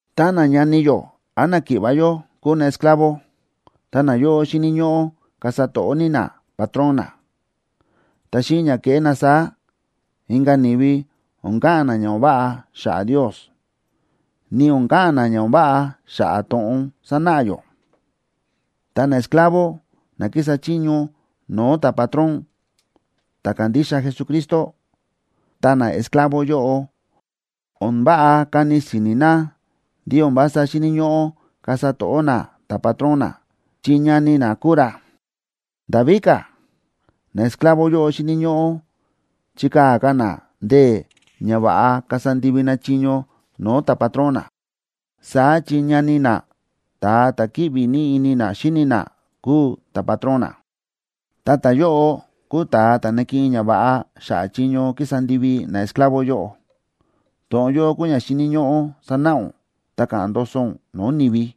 Tá nañani yó án náki̱ꞌva̱ yó kúu naesclavo, ta nayóꞌo xíni̱ ñóꞌó kasa to̱ꞌó ní napatrón na. Ta xíꞌin ña kéꞌé na saá, inka̱ ni̱vi o̱n ka̱ꞌa̱n na ña o̱n váꞌa xa̱ꞌa̱ Ndios, ni o̱n ka̱ꞌa̱n na ña o̱n váꞌa xa̱ꞌa̱ to̱ꞌon sánáꞌa yó. Ta naesclavo na kísa chiño no̱o̱ ta̱patrón ta̱ kándixa Jesucristo, ta naesclavo yóꞌo, o̱n váꞌa kani si̱ni̱ na ndí o̱n vása xíni̱ ñóꞌó kasa to̱ꞌó na ta̱patrón na chi ñani na kúu ra. Nda̱ víka̱, naesclavo yóꞌo xíni̱ ñóꞌó chikaa̱ ka̱ na ndee̱ ña va̱ꞌa kasa ndivi na chiño no̱o̱ ta̱patrón na. Saá chi ñani na, ta̱a ta̱ kíꞌvi ní ini na xíni na kúu ta̱patrón na, ta ta̱yóꞌo kúu ta̱a ta̱ nakiꞌin ñava̱ꞌa xa̱ꞌa̱ chiño kísa ndivi naesclavo yóꞌo. To̱ꞌon yóꞌo kúu ña xíni̱ ñóꞌó sanáꞌa ún ta ka̱ꞌa̱n ndoso ún no̱o̱ ni̱vi.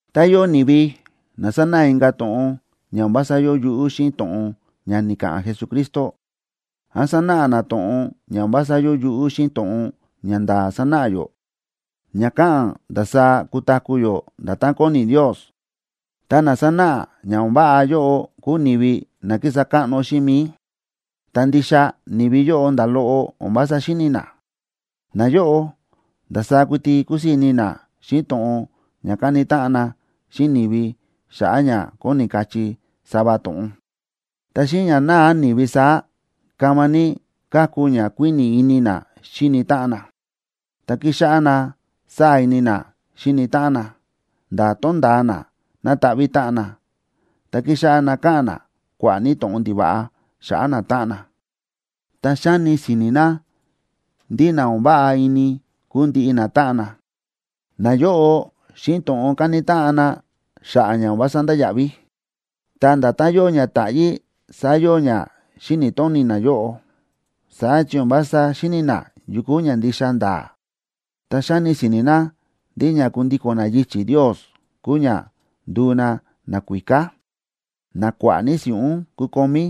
Tá yóo ni̱vi na sánáꞌa inka̱ to̱ꞌon ña o̱n vása yóo yuꞌú xíꞌin to̱ꞌon ña ni̱ka̱ꞌa̱n Jesucristo, án sánáꞌa na to̱ꞌon ña o̱n vása yóo yuꞌú xíꞌin to̱ꞌon ña nda̱a̱ sánáꞌa yó ña káꞌa̱n ndasaá kutaku̱ yó nda̱tán kóni Ndios, ta na sánáꞌa ña o̱n váꞌa yóꞌo kúu ni̱vi na kísa káꞌno xíꞌin mi̱i, ta ndixa ni̱vi yóꞌo nda̱ loꞌo o̱n vása xíni̱ na. Nayóꞌo ndasaá kuiti kúsii̱ ini na xíꞌin to̱ꞌon ña kani táꞌan na xíꞌin ni̱vi xa̱ꞌa̱ ña kóni kachí sava to̱ꞌon. Ta xíꞌin ña náa ni̱vi saá, kama ní káku ña kuíni̱ ini na xíni táꞌan na, ta kíxáꞌá na sáa̱ ini na xíni táꞌan na, nda̱ tonda̱a na nataꞌví táꞌan na, ta kíxáꞌá na káꞌa̱n na kua̱ꞌa̱ ní to̱ꞌon ndiva̱ꞌa xa̱ꞌa̱ natáꞌan na, ta xáni si̱ni̱ na ndí na o̱n váꞌa ini kúu ndiꞌi natáꞌan na. Nayóꞌo, xíꞌin to̱ꞌon káni táꞌan na xa̱ꞌa̱ ña o̱n vása ndáya̱ꞌví. Ta nda̱tán yóo ña táꞌyí saá yóo ña xíni̱ tóni nayóꞌo, saá chi o̱n vása xíni̱ na yu kúu ña ndixa nda̱a̱. Ta xáni si̱ni̱ na ndí ña kundíko̱n na yichi̱ Ndios kúu ña nduu na nakuíká, na kua̱ꞌa̱ ní si̱ꞌún kukomí.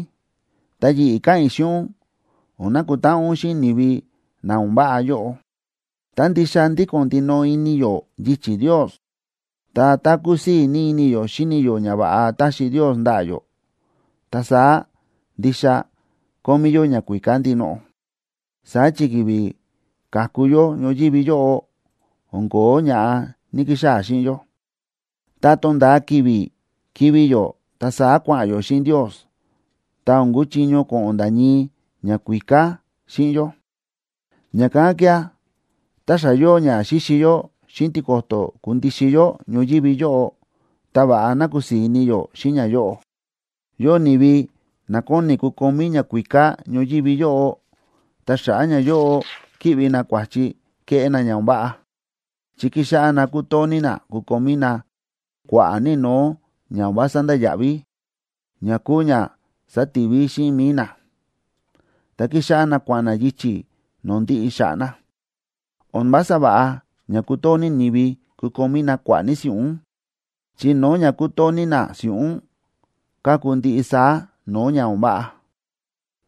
Ta yi̱ꞌi̱ káꞌa̱n i̱ xíꞌin ún o̱n nakutáꞌan ún xíꞌin ni̱vi na o̱n váꞌa yóꞌo. Tá ndixa ndíko̱n ndinoꞌo ini yó yichi̱ Ndios, ta tá kúsii̱ ini yó xíni yó ñava̱ꞌa táxi Ndios ndaꞌa̱ yó, ta saá ndixa kómí yó ñakuíká ndinoꞌo. Saá chi ki̱vi̱ ka̱ku yó ñoyívi yóꞌo, o̱n ko̱ó ña̱ꞌa ní‑kixaa̱ xíꞌin yó. Tá to̱nda̱a ki̱vi̱ kivi̱ yó ta saá kua̱ꞌa̱n yó xíꞌin Ndios, ta o̱n kuchiño ko̱ꞌo̱n nda̱ ñii ñakuíká xíꞌin yó. Ña̱kán kía̱, tá xa yóo ña xíxi yó xíꞌin tiko̱to̱ kundixin yó ñoyívi yóꞌo, ta va̱ꞌa ná kusii̱ ini yó xíꞌin ñayóꞌo. Yóo ni̱vi na kóni kukomí ñakuíká ñoyívi yóꞌo, ta xa̱ꞌa̱ ñayóꞌo kíꞌvi na kua̱chi kéꞌé na ña o̱n váꞌa, chi kíxáꞌá na kútoo ní na kukomí na kua̱ꞌa̱ ní no̱o̱ ña o̱n vása ndáya̱ꞌví, ña kúu ña sátivi xíꞌin mi̱i na, ta kíxáꞌá na kua̱ꞌa̱n na yichi̱ no̱o̱ ndiꞌi xa̱ꞌa̱ na. O̱n vása va̱ꞌa ña kútoo ni̱vi kukomí na kua̱ꞌa̱ ní si̱ꞌún, chi no̱o̱ ña kútoo ní na si̱ꞌún káku ndiꞌi saá no̱o̱ ña o̱n váꞌa.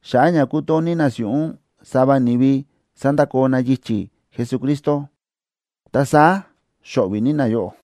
Xa̱ꞌa̱ ña kútoo ní na si̱ꞌún, sava ni̱vi sa̱ndakoo na yichi̱ Jesucristo, ta saá xo̱ꞌvi̱ ní nayóꞌo.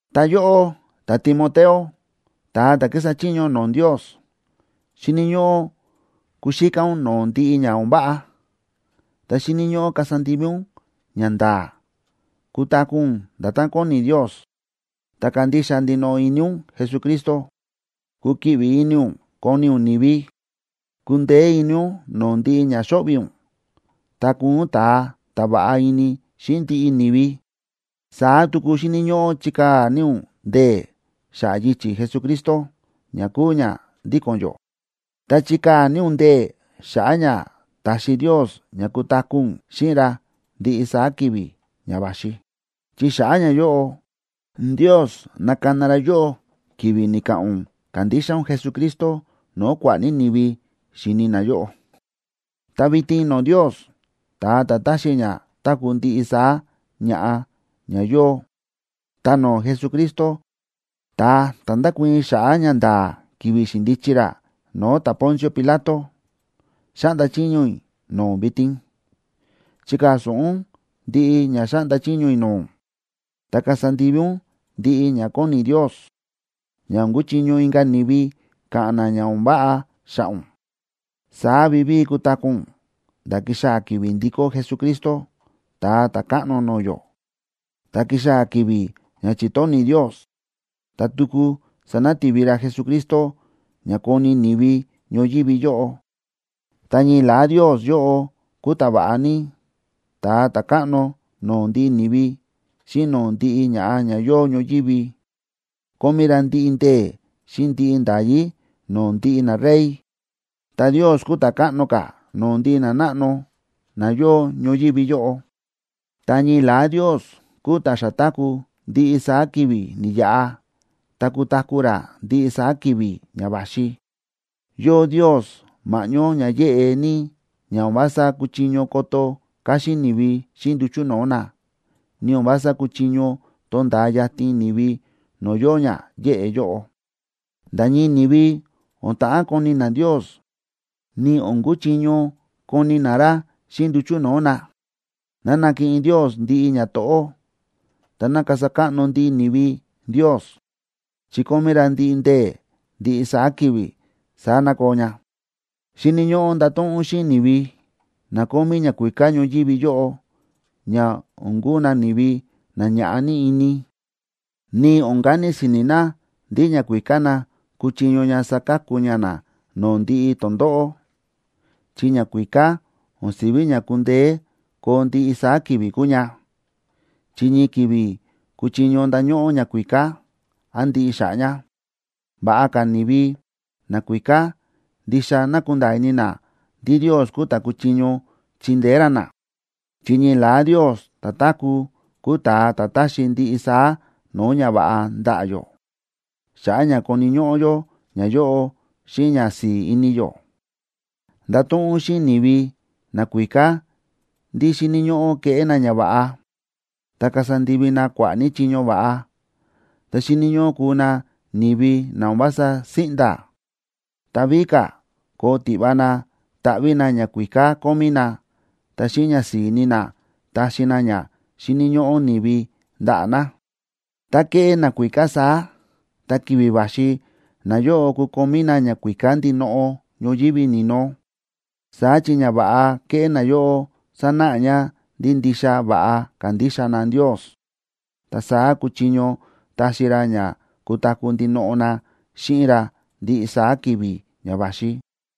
Ta yóꞌó, ta̱Timoteo, ta̱a ta̱ kísa chiño no̱o̱ Ndios, xíni̱ ñóꞌó kuxíká ún no̱o̱ ndiꞌi ña o̱n váꞌa. Ta xíni̱ ñóꞌó kasa ndivi ún ñanda̱a̱, kutaku̱ ún nda̱tán kóni Ndios, ta kandixa ndinoꞌo ini ún Jesucristo. Kukiꞌvi ini ún koni ún ni̱vi, kundeé ini ún no̱o̱ ndiꞌi ña xo̱ꞌvi̱ ún, ta kuu ún ta̱a ta̱ va̱ꞌa ini xíꞌin ndiꞌi ni̱vi. Saá tuku xíni̱ ñóꞌó chikaa̱ ní ún ndee̱ xa̱ꞌa̱ yichi̱ Jesucristo ña kúu ña ndíko̱n yó. Ta chikaa̱ ní ún ndee̱ xa̱ꞌa̱ ña taxi Ndios ña kutaku̱ ún xíꞌin ra ndiꞌi saá ki̱vi̱ ña va̱xi. Chi xa̱ꞌa̱ ñayóꞌo, Ndios na̱kana ra yóꞌó ki̱vi̱ ni̱ka̱ꞌa̱n ún kándixa ún Jesucristo no̱o̱ kua̱ꞌa̱ ní ni̱vi xi̱ni na yóꞌó. Ta vitin no̱o̱ Ndios, ta̱a ta̱ ta̱xi ña táku̱ ndiꞌi saá ña̱ꞌa ña yóo, ta no̱o̱ Jesucristo, ta̱a ta̱ nda̱kuii̱n xa̱ꞌa̱ ñanda̱a̱ ki̱vi̱ xi̱ndichi ra no̱o̱ ta̱Poncio Pilato, xáꞌnda chiño i̱ no̱o̱ ún vitin. Chikaa̱ so̱ꞌo ún ndiꞌi ña xáꞌnda chiño i̱ no̱o̱ ún, ta kasa ndivi ún ndiꞌi ña kóni Ndios, ña o̱n kuchiño inka̱ ni̱vi ka̱ꞌa̱n na ña o̱n váꞌa xa̱ꞌa̱ ún. Saá vivíi kutaku̱ ún nda̱ kixaa̱ ki̱vi̱ ndikó Jesucristo, Ta̱a Ta̱káꞌno no̱o̱ yó. Tá kixaa̱ ki̱vi̱ ña chi̱tóni̱ Ndios, ta tuku sanati̱vi ra Jesucristo ña koni ni̱vi ñoyívi yóꞌo. Ta ñii la̱á Ndios yóꞌo kúu ta̱va̱ꞌa ní, ta̱a ta̱káꞌno no̱o̱ ndiꞌi ni̱vi xíꞌin no̱o̱ ndiꞌi ñaꞌa̱ ña yóo ñoyívi. Kómí ra ndiꞌi ndee̱ xíꞌin ndiꞌi nda̱yí no̱o̱ ndiꞌi narey, ta Ndios kúu ta̱ káꞌno ka̱ no̱o̱ ndiꞌi nanáꞌno na yóo ñoyívi yóꞌo. Ta ñii la̱á Ndios kúu ta̱ xa táku̱ ndiꞌi saá ki̱vi̱ ni̱yaꞌa ta kutaku̱ ra ndiꞌi saá ki̱vi̱ ña va̱xi. Yóo Ndios ma̱ꞌñó ña yéꞌe ní ña o̱n vása kúchiño koto káxín ni̱vi xíꞌin nduchu̱ no̱o̱ na, ni o̱n vása kúchiño tonda̱a yatin ni̱vi no̱o̱ yóo ña yéꞌe yóꞌo. Nda̱ ñii ni̱vi o̱n ta̱ꞌán koni na Ndios, ni o̱n kuchiño koni na ra xíꞌin nduchu̱ no̱o̱ na. ¡Ná nakiꞌin Ndios ndiꞌi ñato̱ꞌó, ta ná kasa káꞌno ndiꞌi ni̱vi Ndios, chi kómí ra ndiꞌi ndee̱ ndiꞌi saá ki̱vi̱! Saá ná koo ña. Xíni̱ ñóꞌó ndato̱ꞌon ún xíꞌin ni̱vi na kómí ñakuíká ñoyívi yóꞌo ña o̱n kuu na ni̱vi na ñaꞌa̱ ní ini, ni o̱n kani si̱ni̱ na ndí ñakuíká na kúchiño ña saka̱ku ña na no̱o̱ ndiꞌi tondóꞌó, chi ñakuíká o̱n si̱ví ña kundeé koo ndiꞌi saá ki̱vi̱ kúu ña, chi ñii ki̱vi̱ kuchiño ndañóꞌó ñakuíká, án ndiꞌi xa̱ꞌa̱ ña. Va̱ꞌa ka̱ ni̱vi nakuíká ndixa ná kundaa ini na ndí Ndios kúu ta̱ kúchiño chindeé ra na, chi ñii la̱á Ndios ta̱táku̱ kúu ta̱a ta̱ táxi ndiꞌi saá no̱o̱ ñava̱ꞌa ndaꞌa̱ yó, xa̱ꞌa̱ ña koni̱ ñóꞌó yó ñayóꞌo xíꞌin ñasi̱i̱ ini yó. Ndato̱ꞌon ún xíꞌin ni̱vi nakuíká ndí xíni̱ ñóꞌó keꞌé na ñava̱ꞌa, ta kasa ndivi na kua̱ꞌa̱ ní chiño va̱ꞌa. Ta xíni̱ ñóꞌó kuu na ni̱vi na o̱n vása síꞌnda̱, ta víka̱ koo tiꞌva na taꞌví na ñakuíká kómí na, ta xíꞌin ñasi̱i̱ ini na taxi na ña xíni̱ ñóꞌó ni̱vi ndaꞌa̱ na. Tá keꞌé nakuíká saá, ta ki̱vi̱ va̱xi nayóꞌo kukomí na ñakuíká ndinoꞌo ñoyívi ni̱no. Saá chi ñava̱ꞌa kéꞌé nayóꞌo sánáꞌa ña ndí ndixa va̱ꞌa kándixa na Ndios. Ta saá kuchiño taxi ra ña kutaku̱ ndinoꞌo na xíꞌin ra ndiꞌi saá ki̱vi̱ ña va̱xi.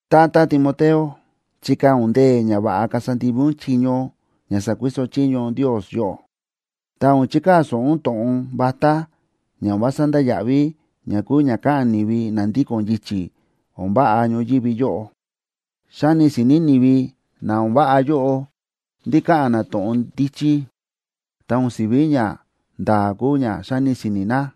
Tata Timoteo, chikaa̱ ún ndee̱ ña va̱ꞌa kasa ndivi ún chiño ña sa̱kuiso chiño Ndios yóꞌó. Ta o̱n chikaa̱ so̱ꞌo ún to̱ꞌon vatá ña o̱n vása ndáya̱ꞌví ña kúu ña káꞌa̱n ni̱vi na ndíko̱n yichi̱ o̱n váꞌa ñoyívi yóꞌo. Xáni si̱ni̱ ni̱vi na o̱n váꞌa yóꞌo ndí káꞌa̱n na to̱ꞌon ndíchí, ta o̱n si̱ví ñanda̱a̱ kúu ña xáni si̱ni̱ na.